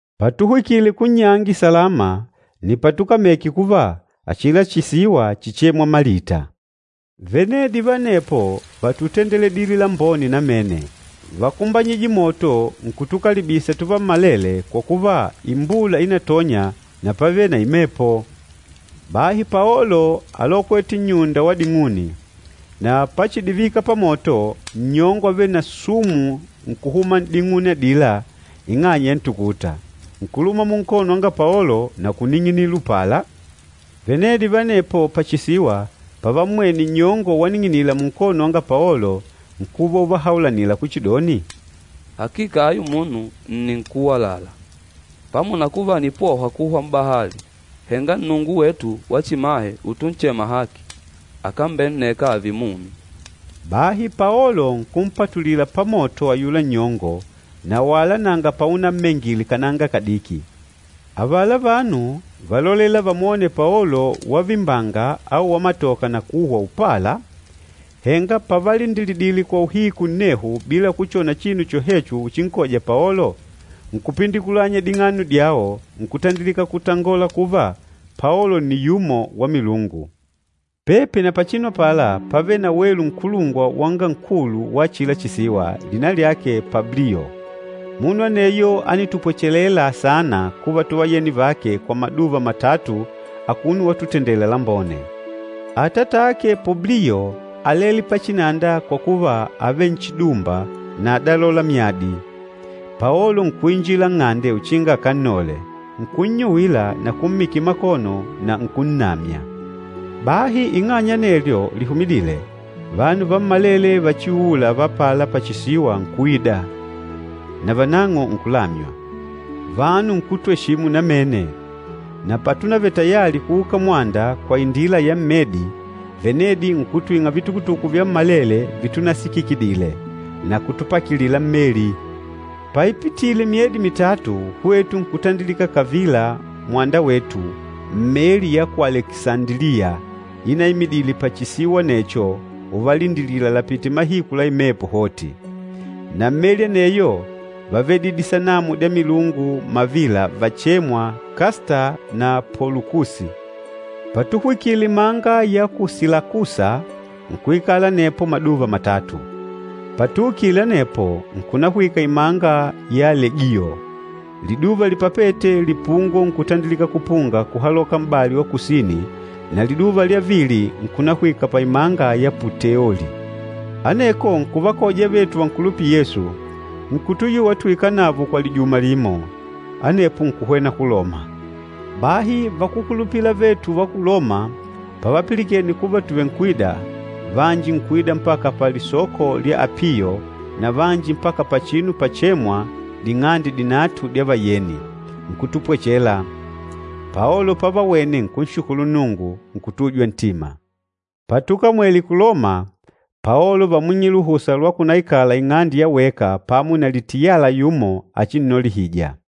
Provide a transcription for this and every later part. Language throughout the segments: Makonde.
Patuhwikile kunnyangi salama, nni patukameke kuva achila chisiwa chíchemwa Malita. Venedi va anepo vátutendeledile lambone namene. Vákumbanyije moto nkutukalibisa tuvammalele kwa kuva imbula ínatonya na pávele na imepo. Bahi Paolo álokwete nnyunda wa ding'uni, na pachidivika pamoto, nnyongo avêle na sumu nkuhuma n'ding'uni adila ing'anya ya ntukuta, nkuluma munkono wanga Paolo na kuning'inila upala. Venedi va anepo pachisiwa pavammwene nnyongo waning'inila munkono wanga Paolo, nkuva uvahaulanila kuchidoni, “Hakika ayu munu nni nkúwalala, pamo na kuva ànipohwa kuhwa m'bahali, henga nnungu wetu wachimahe utunchema Haki, akambenneka ààve mumi!” Bahi Paolo nkumpatulila pamoto ayula nnyongo na wala nanga paunammengile kananga kadiki. Avala vanu válolela vamwone Paolo wavimbanga au wamatoka na kuhwa upala. Henga pavalindilidile kwa uhiku nnehu bila kuchona chinu chohecho uchinkoja Paolo, nkupindikulanya ding'ano dyao nkutandilika kutangola kuva Paolo nni yumo wa milungu. Pepi na pachinu apala pávele na welu nkulungwa wanga nkulu wa achila chisiwa, lina lyake Publiyo. Munu aneyo ánitupwachelela saana kuva tuvayeni vake kwa maduva matatu akuno watutendela lambone. Atatake Publiyo álele pachinanda kwa kuva ávele nchidumba na ádalola myadi. Paolo nkuinji nng'ande uchinga akannole, nkunnyuwila na kummikila makono na nkunnamya. Bahi ng'anya ya anelyo lihumidîle, vanu vammalele vachiuûla va apala pachisiwa nkuida, navanang'o nkulamywa. Vanu nkutweshimu namene, na patunavele tayali kuuka mwanda kwa indila ya mmedi, venedi nkutwing'a vitukutukutu vyammalele vitunasikikidile, na kutupakilila mmeli. Paipitile myedi mitatu, hwetu nkutandilika kavila mwanda wetu mmeli ya ku Alekisandiliya inaimidile pachisiwa anecho uvalindilila lapite mahiku la imepo hoti. Na mmeli aneyo vávedile disanamu dya milungu mavila vachêmwa, Kasta na Polukusi. Patuhwikile imanga ya ku Silakusa, nkuikala anepo maduva matatu. Patuukile anepo, nkunahwika imanga ya Legiyo. Liduva lipapête, lipungo nkutandilika kupunga kuhaloka m'bali wa kusini, na liduva lya vili nkunahwika paimanga ya Puteoli. Aneko nkuvakoja avetu vankulupîla Yesu, nkutuyuwa tuikale navo kwa lijuma limo. Anepo nkuhwena ku Loma. Bahi vakúkulupila avetu va ku Loma pavapilikene kuva tuvenkwida, vanji nkuida mpaka Palisoko lya Apiyo na vanji mpaka pachinu pachemwa, “Ding'ande Dinatu dya Vayeni,” nkutupwechela. Paolo pavawene nkunshukulu Nnungu, nkutujwa ntima. Patukamwele ku Loma, Paolo vámwing'ile luhusa lwa kunaikala ing'ande ya weka pamo na litiyala yumo achinnolihija.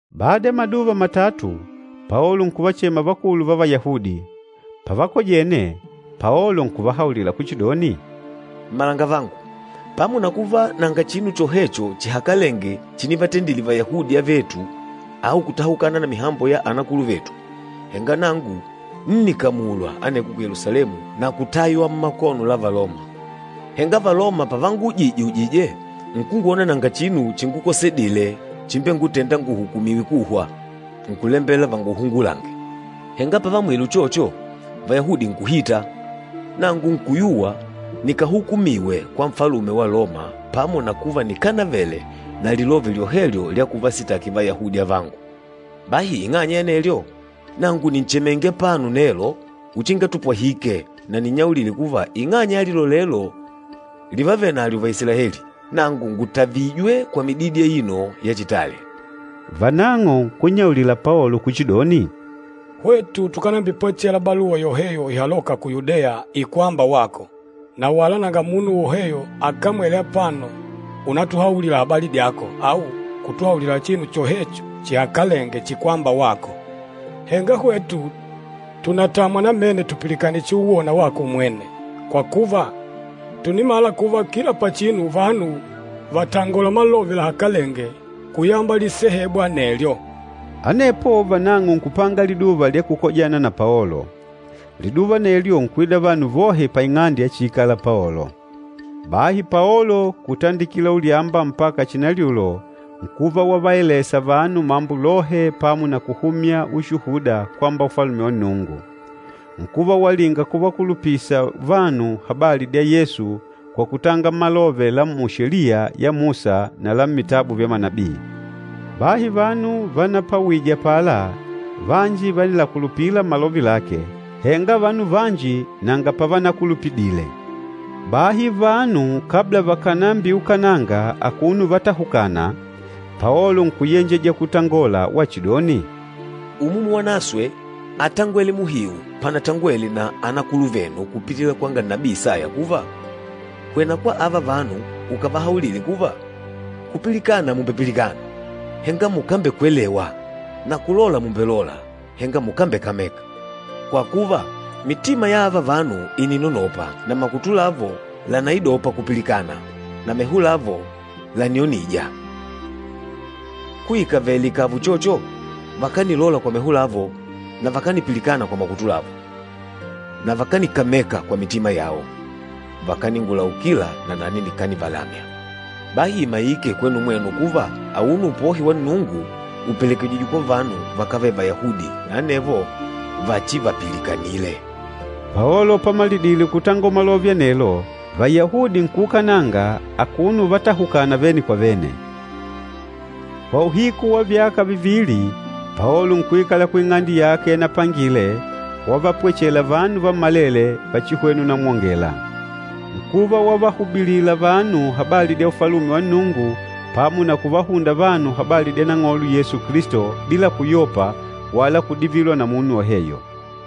Bada ya maduva matatu, Paolo nkuvachema vakulu va Vayahudi. Pavakojene, Paolo nkuvahaulila kuchidoni, “Mmalangavangu, pamo na kuva nanga chinu chohecho chihakalenge chinivatendile Vayahudi avetu au kutahukana na mihambo ya anakuluvetu, henga nangu ńnikamulwa aneko ku Yelusalemu na kutaywa mmakono la Valoma. Henga Valoma pavanguujije-ujije nkungwona nanga chinu chingukosedile chimbengutênda nguhukumiwe kuhwa, nkulembela vanguhungulange. Henga pavaamwile uchocho, Vayahudi nkuhita, nangu nkuyuwa nikahukumiwe kwa Nfalume wa Loma pamo na kuva nikanavele na lilove lyohelyo lya kuvasitaki Vayahudi avangu. Bahi ing'anya ya anelyo, nangu nìnchemenge apano nelo uchinga tupwahike na ninnyaulile kuva ing'anya ya lilolelo livavenalyo Vaisilaeli, nangu ngùtavijwe kwa mididi aino ya chitale.” Vanang'o nkunnyaulila Paolo kuchidoni, “Hwetu tukanambipwachela baluwa yoheyo ihalôka ku Yudeya ikwâmba wako, na wala nanga munu woheyo akamwêle apano unatuhaulila habali dyako au kutuhaulila chinu chohecho chihakalenge chikwâmba wako. Henga hwetu tùnatamwa namene tupilikane chiuwona wako umwene, kwa kuva, tùnimala kuva kila pachinu vanu vàtangola malove lahakalenge kuyamba lisehebu anelyo.” Anepo vanang'o nkupanga liduva lya kukojana na Paolo. Liduva anelyo nkuida vanu vohe paing'ande yachiikala Paolo. Bahi Paolo, kutandikila ulyamba mpaka chinalyulo nkuva wavaelesa vanu mambo lohe pamo na kuhumya ushuhuda kwamba Ufalume wa Nnungu. Nkuva walinga kuvakulupisa vanu habali dya Yesu kwa kutanga malove la mu Sheliya ya Musa na la mmitabu vya manabii. Bahi vanu vanapawije apala vanji vánilakulupila malove lake, henga vanu vanji nanga pavanakulupidile. Bahi vanu kabla vakànambiukananga akuno uvatahukana, Paolo nkuyenjeja kutangola wachidoni, “Umumu Wanaswe átangwele muhiu panatangwele na anakuluvenu kupitila kwanga nabii Isaya kuva, ‘Hwena kwa ava vanu ukavahaulile kuva, “Kupilikana mùmbepilikana, henga mukambekwelewa, na kulola mùmbelola, henga mukambekameka. Kwa kuva, mitima ya ava vanu ìninonopa, na makutu lavo lànaidopa kupilikana na meho lavo lànionija. Kuikavele ikàva uchocho, vakanilola kwa meho lao, na vakanipilikana kwa makutu lao, na vakanikameka kwa mitima yao, vakaningulaukila, nanani nikanivalamya.” ’ Bahi imaike kwenu mwenu kuva auno upohi wa Nnungu ùpelekejijwe kwa vanu vakávele Vayahudi na anevo vachivapilikanile.” Paolo pamalidile kutangola malove anelo, Vayahudi nkuukananga akuno uvatahukana vene kwa vene. Kwa uhiku wa vyaka vivili Paolo nkuikala kuing'ande yake yanapangile, wavapwechela vanu vammalele vachihwena unamwongela. Nkuva wavahubilila vanu habali dya Ufalume wa Nnungu pamo na kuvahunda vanu habali dya Nang'olo Yesu Kilisto, bila kuyopa wala kudivilwa na munu woheyo.